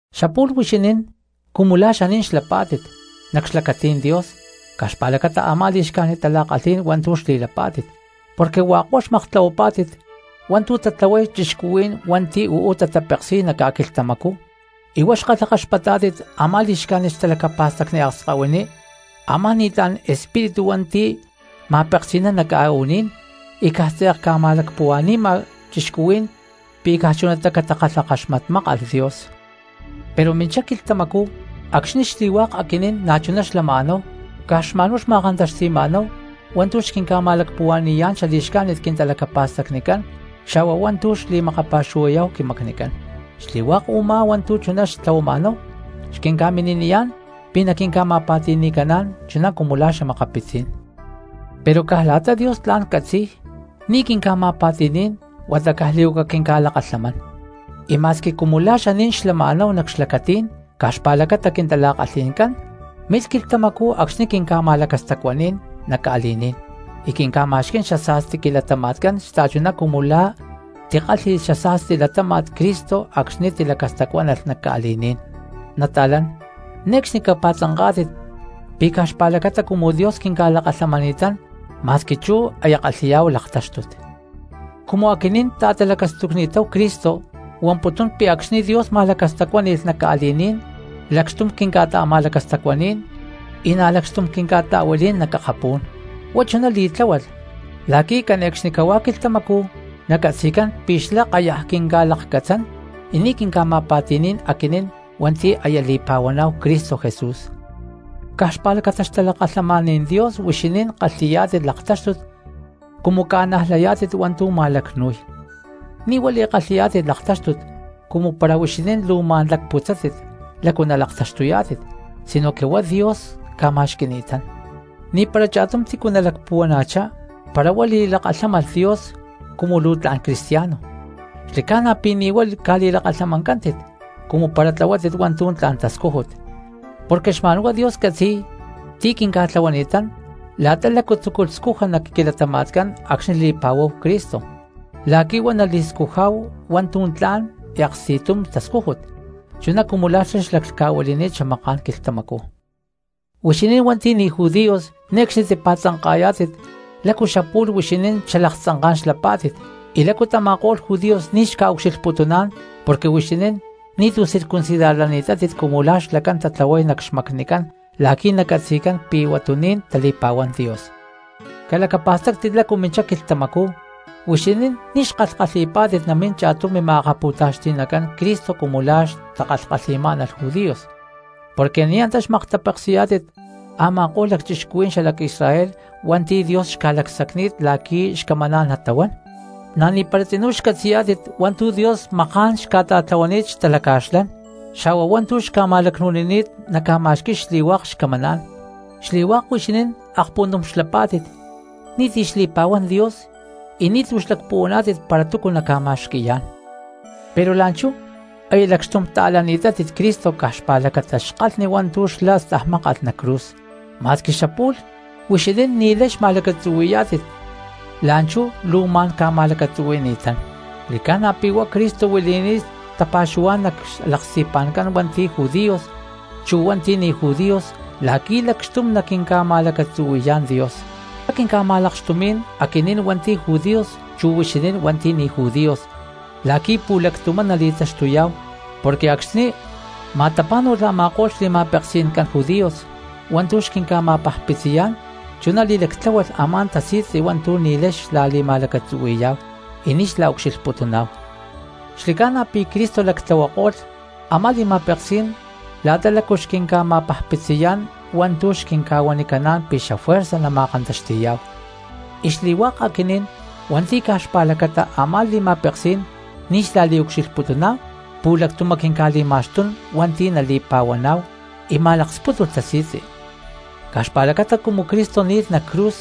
Xapu̠lh huixinín cumu la̠ xaní̠n xlapá̠tit nac xlacatí̠n Dios caj xpa̠lacata a̠má li̠xcájnit tala̠kalhí̠n hua̠ntu̠ xli̠lapá̠tit, porque hua̠k huá xmaktlahuapá̠tit hua̠ntu̠ tatlahuay cristianos hua̠nti̠ uú tatapeksi̠y nac ca̠quilhtamacú, y huá xkalhakaxpatá̠tit a̠má li̠xcájnit xtalacapa̠stacni akskahuiní a̠má ni̠tlá̠n espíritu hua̠nti̠ ma̠peksi̠nán nac ca̠u̠ní̠n y caj tze̠k ca̠ma̠lacpuhua̠ni̠ma cristianos pi̠ caj chunatá catakalhakaxmatmákalh Dios. Pero minchá quilhtamacú acxni̠ xli̠hua̠k aquinín na̠chuná xlama̠náhu caj xma̠n huá xma̠kantaxti̠ma̠náhu hua̠ntu̠ xquinca̠ma̠lacpuhua̠ni̠yá̠n xali̠xcájnit quintalacapa̠stacnicán xa̠hua hua̠ntu̠ xli̠makapa̠xuhuayá̠hu quimacnicán, xli̠hua̠k u̠má hua̠ntu̠ chuná xtlahuama̠náhu xquinca̠mini̠niyá̠n pi̠ naquinca̠ma̠pa̠ti̠ni̠caná̠n chuná cumu la̠ xa̠makapitzí̠n. Pero caj la̠ta Dios tla̠n catzi̠y ni̠ quinca̠ma̠pa̠ti̠ní̠n huata caj li̠huaca quinca̠lakalhamán, y ma̠squi cumu la̠ xaní̠n xaclama̠náhu nac xlacatí̠n caj xpa̠lacata quintala̠kalhí̠ncán milh quilhtamacú acxni̠ quinca̠ma̠lacastacuáni̠lh nac ca̠li̠ní̠n y quinca̠ma̠xquí̠n xasa̠sti quilatama̠tcán xta̠chuná cumu la̠ tikálhi̠lh xasa̠sti latáma̠t Cristo acxni̠ tilacastacuánalh nac ca̠li̠ní̠n. Nata̠lán, ne̠cxni capa̠tzanká̠tit pi̠ caj xpa̠lacata cumu Dios quinca̠lakalhamani̠tán ma̠squi chú aya kalhi̠yá̠hu laktáxtut. Cumu aquinín ta̠talacastucni̠táhu Cristo huamputún pi̠ acxni̠ Dios ma̠lacastacuáni̠lh nac ca̠li̠ní̠n lacxtum quinca̠ta̠ma̠lacastacuaní̠n y na̠ lacxtum quinca̠ta̠huilí̠n nac akapú̠n. Huá chuná li̠tláhualh la̠qui̠ cane̠cxnicahuá quilhtamacú nacatzi̠cán pi̠ xlá kayaj quinca̠lakcatzán y ni̠ quinca̠ma̠pa̠ti̠ní̠n aquinín hua̠nti̠ aya li̠pa̠huaná̠hu Cristo Jesús. Caj xpa̠lacata xtalakalhamaní̠n Dios huixinín kalhi̠yá̠tit laktáxtut cumu ca̠najlayá̠tit hua̠ntu̠ ma̠lacnu̠y, ni̠ huá li̠kalhi̠yá̠tit laktáxtut cumu para huixinín luu ma̠n lacputzátit lácu nalaktaxtuyá̠tit, sinoque huá Dios ca̠ma̠xqui̠ni̠tán. Ni̠para cha̠tum tícu nalacpuhuana̠chá para huá li̠lakalhámalh Dios cumu luu tla̠n cristiano, xli̠ca̠na pi̠ ni̠ huá ca̠li̠lakalhamancántit cumu para tlahuátit hua̠ntu̠ tla̠n tascújut. Porque xma̠nhuá Dios catzi̠y tu̠ quinca̠tlahuani̠tán la̠ta lácu tzúculh scuja nac quilatama̠tcán acxni̠ li̠pa̠huáhu Cristo, la̠qui̠ huá nali̠scujá̠hu hua̠ntu̠ tla̠n y aksti̠tum tascújut, chuná cumu la̠ xlá xlaclhca̠huili̠ni̠t xamaká̠n quilhtamacú. Huixinín hua̠nti̠ ni̠ judíos ne̠cxni tipa̠tzanka̠yá̠tit lácu xapu̠lh huixinín xalaktzanká̠n xlapá̠tit y lácu tama̠ko̠lh judíos ni̠tu̠ xca̠ucxilhputuná̠n porque huixinín ni̠tu̠ circuncidarlani̠tátit cumu la̠ xlacán tatlahuay nac xmacnicán la̠qui̠ nacatzi̠cán pi̠ huatuní̠n tali̠pa̠huán Dios. Calacapa̠stáctit lácu minchá quilhtamacú huixinín ni̠ xkalhkalhi̠pá̠tit namín cha̠tum mima̠akapu̠taxti̠nacán Cristo cumu la̠ xtakalhkalhi̠má̠nalh judíos, porque ni̠ antá xmaktapeksi̠yá̠tit a̠ma̠ko̠lh cristianos xalac Israel hua̠nti̠ Dios xca̠lacsacni̠t la̠qui̠ xcamaná̠n natahuán, na̠ ni̠para tzinú xcatzi̠yá̠tit hua̠ntu̠ Dios maká̠n xca̠ta̠tlahuani̠t xtalaca̠xlán, xa̠hua hua̠ntu̠ xca̠ma̠lacnu̠nini̠t naca̠ma̠xqui̠y xli̠hua̠k xcamaná̠n. Xli̠hua̠k huixinín akpuntum xlapá̠tit ni̠ti̠ xli̠pa̠huán Dios y ni̠tu̠ xlacpuhuaná̠tit para túcu naca̠ma̠xqui̠yá̠n. Pero la̠nchú aya lacxtum ta̠lani̠tátit Cristo caj xpa̠lacata xkalhni hua̠ntu̠ xlá stajmákalh nac cruz, ma̠squi xapu̠lh huixinín ni̠lay xma̠lacatzuhui̠yá̠tit la̠nchú luu ma̠n ca̠ma̠lacatzuhui̠ni̠tán. Xli̠ca̠na pi̠ huá Cristo huili̠ni̠t tapa̠xuhuá̠n nac xlaksti̠pa̠ncán hua̠nti̠ judíos chu hua̠nti̠ ni̠ judíos la̠qui̠ lacxtum naquinca̠ma̠lacatzuhui̠yá̠n Dios. Xlá quinca̠ma̠lakxtumí̠n aquinín hua̠nti̠ judíos chu huixinín hua̠nti̠ ni̠ judíos la̠qui̠ pu̠lactumá nali̠taxtuyá̠hu porque acxni̠ ma̠tapá̠nu̠lh a̠ma̠ko̠lh xli̠ma̠peksi̠ncán judíos hua̠ntu̠ xquinca̠ma̠pajpitziyá̠n chuná li̠lactláhualh a̠má tasi̠tzi hua̠ntu̠ ni̠lay xla̠li̠ma̠lacatzuhui̠yá̠hu y ni̠ xla̠ucxilhputuná̠hu. Xli̠ca̠na pi̠ Cristo lactlahuako̠lh a̠má li̠ma̠peksí̠n la̠ta lácu xquinca̠ma̠pajpitziyá̠n, hua̠ntu̠ xquinca̠huanicaná̠n pi̠ xafuerza nama̠kantaxti̠yá̠hu, y xli̠hua̠k aquinín hua̠nti̠ caj xpa̠lacata a̠má li̠ma̠peksí̠n ni̠ xla̠liucxilhputuná̠hu pu̠lactumá quinca̠li̠ma̠xtún hua̠nti̠ nali̠pa̠huaná̠hu, y ma̠lakspútulh tasi̠tzi. Caj xpa̠lacata cumu Cristo ni̠lh nac cruz,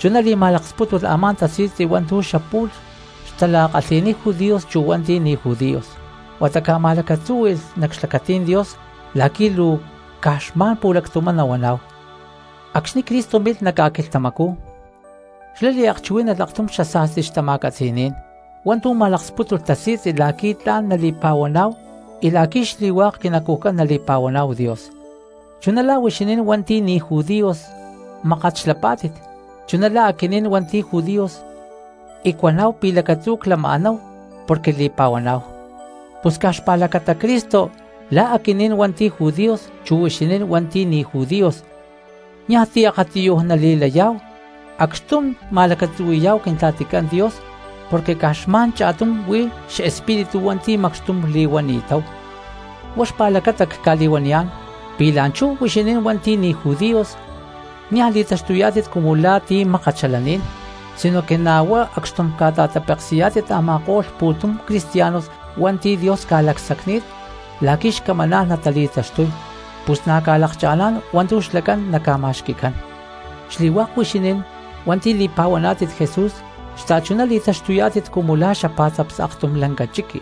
chuná li̠ma̠lakspútulh a̠má tasi̠tzi hua̠ntu̠ xapu̠lh xtala̠kalhi̠niy judíos chu hua̠nti̠ ni̠ judíos, huata ca̠ma̠lacatzúhui̠lh nac xlacatí̠n Dios la̠qui̠ luu caj xma̠n pu̠lactumá nahuaná̠hu. Acxni̠ Cristo milh nac ca̠quilhtamacú xlá liakchuhuí̠nalh aktum xasa̠sti xtama̠catzi̠ní̠n hua̠ntu̠ ma̠lakspútulh tasi̠tzi la̠qui̠ tla̠n nala̠li̠pa̠huaná̠hu y la̠qui̠ xli̠hua̠k quinacujcán nali̠pa̠huaná̠hu Dios, chuná la̠ huixinín hua̠nti̠ ni̠ judíos mákat xlapá̠tit, chuná la̠ aquinín hua̠nti̠ judíos y cuaná̠hu pi̠ lacatzú lama̠níhu porque li̠pa̠huaná̠hu. Pus caj xpa̠lacata Cristo la̠ aquinín hua̠nti̠ judíos chu huixinín hua̠nti̠ ni̠ judíos niaj ti̠ akatiyuj nali̠layá̠hu acxtum ma̠lacatzuhui̠yá̠hu Quintla̠ticán Dios porque caj xma̠n cha̠tum huí xespíritu hua̠nti̠ macxtum li̠huani̠táhu. Huá xpa̠lacata cca̠li̠huaniyá̠n pi̠ la̠nchú huixinín hua̠nti̠ ni̠ judíos niaj li̠taxtuyá̠tit cumu la̠ ti̠ mákat xalaní̠n, sinoque na̠ huá acxtum ca̠ta̠tapeksi̠yá̠tit a̠ma̠ko̠lh pu̠tum cristianos hua̠nti̠ Dios ca̠lacsacni̠t la̠qui̠ xcamaná̠n natali̠taxtuy, pus na̠ ca̠lakcha̠ná̠n hua̠ntu̠ xlacán naca̠ma̠xqui̠cán. Xli̠hua̠k huixinín hua̠nti̠ li̠pa̠huaná̠tit Jesús xta̠chuná li̠taxtuyá̠tit cumu la̠ xapá̠tzaps aktum lanca chiqui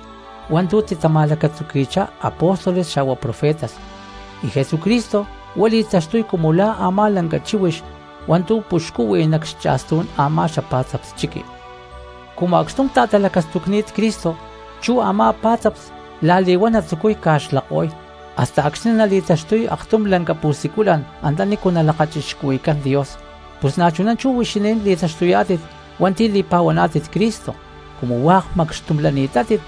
hua̠ntu̠ titama̠lacatzuqui̠chá apóstoles xa̠hua profetas, y Jesucristo huá li̠taxtuy cumu la̠ a̠má lanca chíhuix hua̠ntu̠ puxcúhui nac xcha̠stú̠n a̠má xapá̠tzaps chiqui. Cumu acxtum ta̠talacastucni̠t Cristo chú a̠má pá̠tzaps la̠li̠huán natzucuy ca̠xlako̠y hasta acxni̠ nali̠taxtuy aktum la̠n pu̠siculan antanícu nalakachixcuhui̠cán Dios. Pus na̠chuná chú huixinín li̠taxtuyá̠tit hua̠nti̠ li̠pa̠huaná̠tit Cristo, cumu hua̠k macxtum lani̠tátit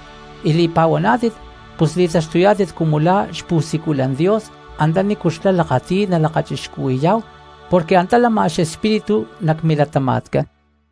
y li̠pa̠huaná̠tit, pus li̠taxtuyá̠tit cumu la̠ xpu̠siculan Dios antanícu xlá lakati̠y nalakachixcuhui̠yá̠hu porque antá lama xespíritu nac milatama̠tcán.